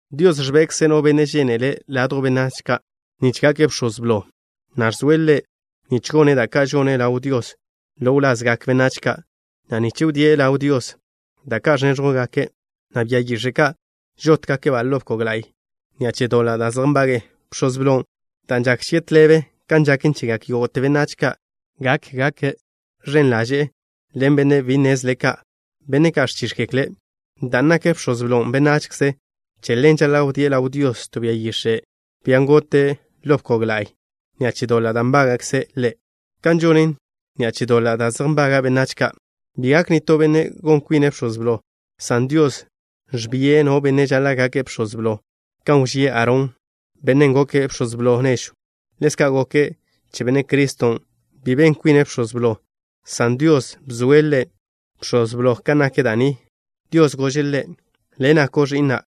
Dios ẕbekze' no benne' žénele' ladjw benách ka', nich gake' bx̱oz blo, na' ẕzoe' ḻe' nich gone' da' ka' žone' ḻaw Dios ḻo wlazgak benách ka', na' nich wdíe' ḻaw Dios da' ka' ẕnéẕjwgake', na' bia yix̱e' ka' žótgake' ḻo bkog la'y ni'a che doḻa' da' zej nbage'e. Bx̱oz blon', dan' žak chie' tḻebe kan žaken chegak yógo'te benách ka', gak gake' ẕen ḻaže' ḻen benne' bi nnezle ka', benne' ka' ẕchíx̱gekle'. Dan' nak bx̱oz blon' benachze, che ḻen žaḻa' wdíe' ḻaw Dios to bia yix̱e', bian' gote' ḻo bkog la'y, ni'a che doḻa' da' nbága'kze' ḻe', kan žone' ni'a che doḻa' da' zej nbaga' benách ka'. Bi gak nitó benne' gon kwine' bx̱oz blo, san Dios ẕbie' no benne' žaḻa' gake' bx̱oz blo, kan wžíe' Aarón, bennen' goke' bx̱oz blo nežw. Ḻezka' goken che Benne' Criston', bi ben kwine' Bx̱oz Blo, san Dios bzoe' Ḻe' Bx̱oz Blo. Kan nak da' ni, Dios gože' Ḻe': Le' nako' Ẕi'na'.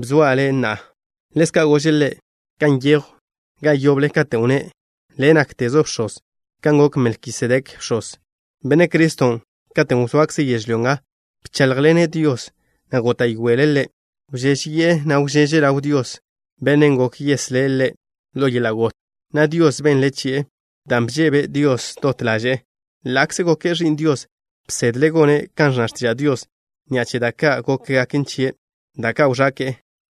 Bzoa' Le' na'a. Ḻezka' gože' Ḻe' kan nyejw ga yoble, katen' wnné': Le' náktezo' Bx̱oz, kan gok Melkisedek bx̱oz. Benne' Criston', katen' wzoakze' yežlyó nga, bcháḻjḻene' Dios, na' góta'yoele' Ḻe'. Wžéžeyi'e, na' wžeže' ḻaw Dios, Bennen' gok yeslé' Ḻe' ḻo yeḻa' got, na' Dios benle' chie' dan' bžebe' Dios dot ḻaže'e. Ḻa'kze goke' Ẕi'n Dios, bsedle' gone' kan ẕnna x̱tiža' Dios ni'a che da' ka' gókgaken chie', da' ka' wẕake'e.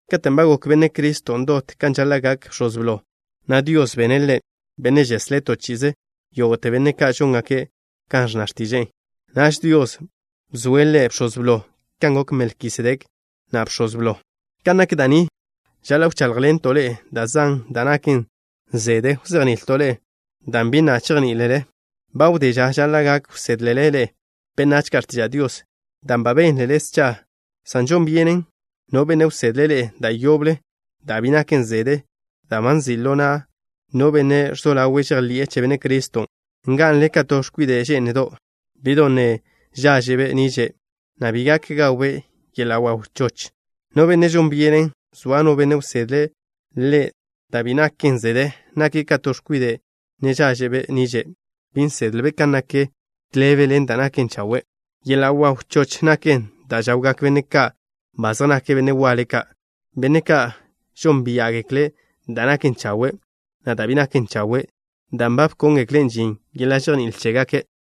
Katen' ba gok Benne' Criston' dot kan žaḻa' gak Bx̱oz Blo, na' Dios bene' Ḻe' Benne' žeslé' to chi'ize yógo'te benne' ka' žóngake' kan ẕnna x̱tiže'e. Naž Dios bzoe' Ḻe' Bx̱oz Blo kan gok Melkisedek na' bx̱oz blo. Kan nak da' ni, žaḻa' wcháḻjḻento' ḻe'e da' zan, dan' naken zede wzejni'ilto' ḻe'e, dan' bi na' chejní'ilele. Ba wdé ža žaḻa' gak wsédlele ḻe'e benách ka' x̱tiža' Dios, dan' ba bénlele scha, san žon byenen no benne' wsedle' ḻe'e da' yoble da' bi naken zede dan' ba nzi' ḻo na' no benne' ẕzo ḻawe' žejḻi'e che Benne' Criston'. Nga'nle ka to x̱kwide' že'ndo', bi'don' ne žáẕe'be' niže', na' bi gak gawbe' yeḻa' waw choch. No benne' žon byenen soa no benne' wsedle' ḻe' da' bi naken zede, nake' ka to x̱kwide' ne žáẕe'be' niže'. Bi nsedle' kan nak tḻebe ḻen da' naken chawe'. Yeḻa' waw choch naken da' žawgak benne' ka' ba zej nake' benne' waḻe ka', benne' ka' žónbia'gekle' da' naken chawe', na' da' bi naken chawe', dan' ba bkóngekle' žin yeḻa' žejní'il chégake'.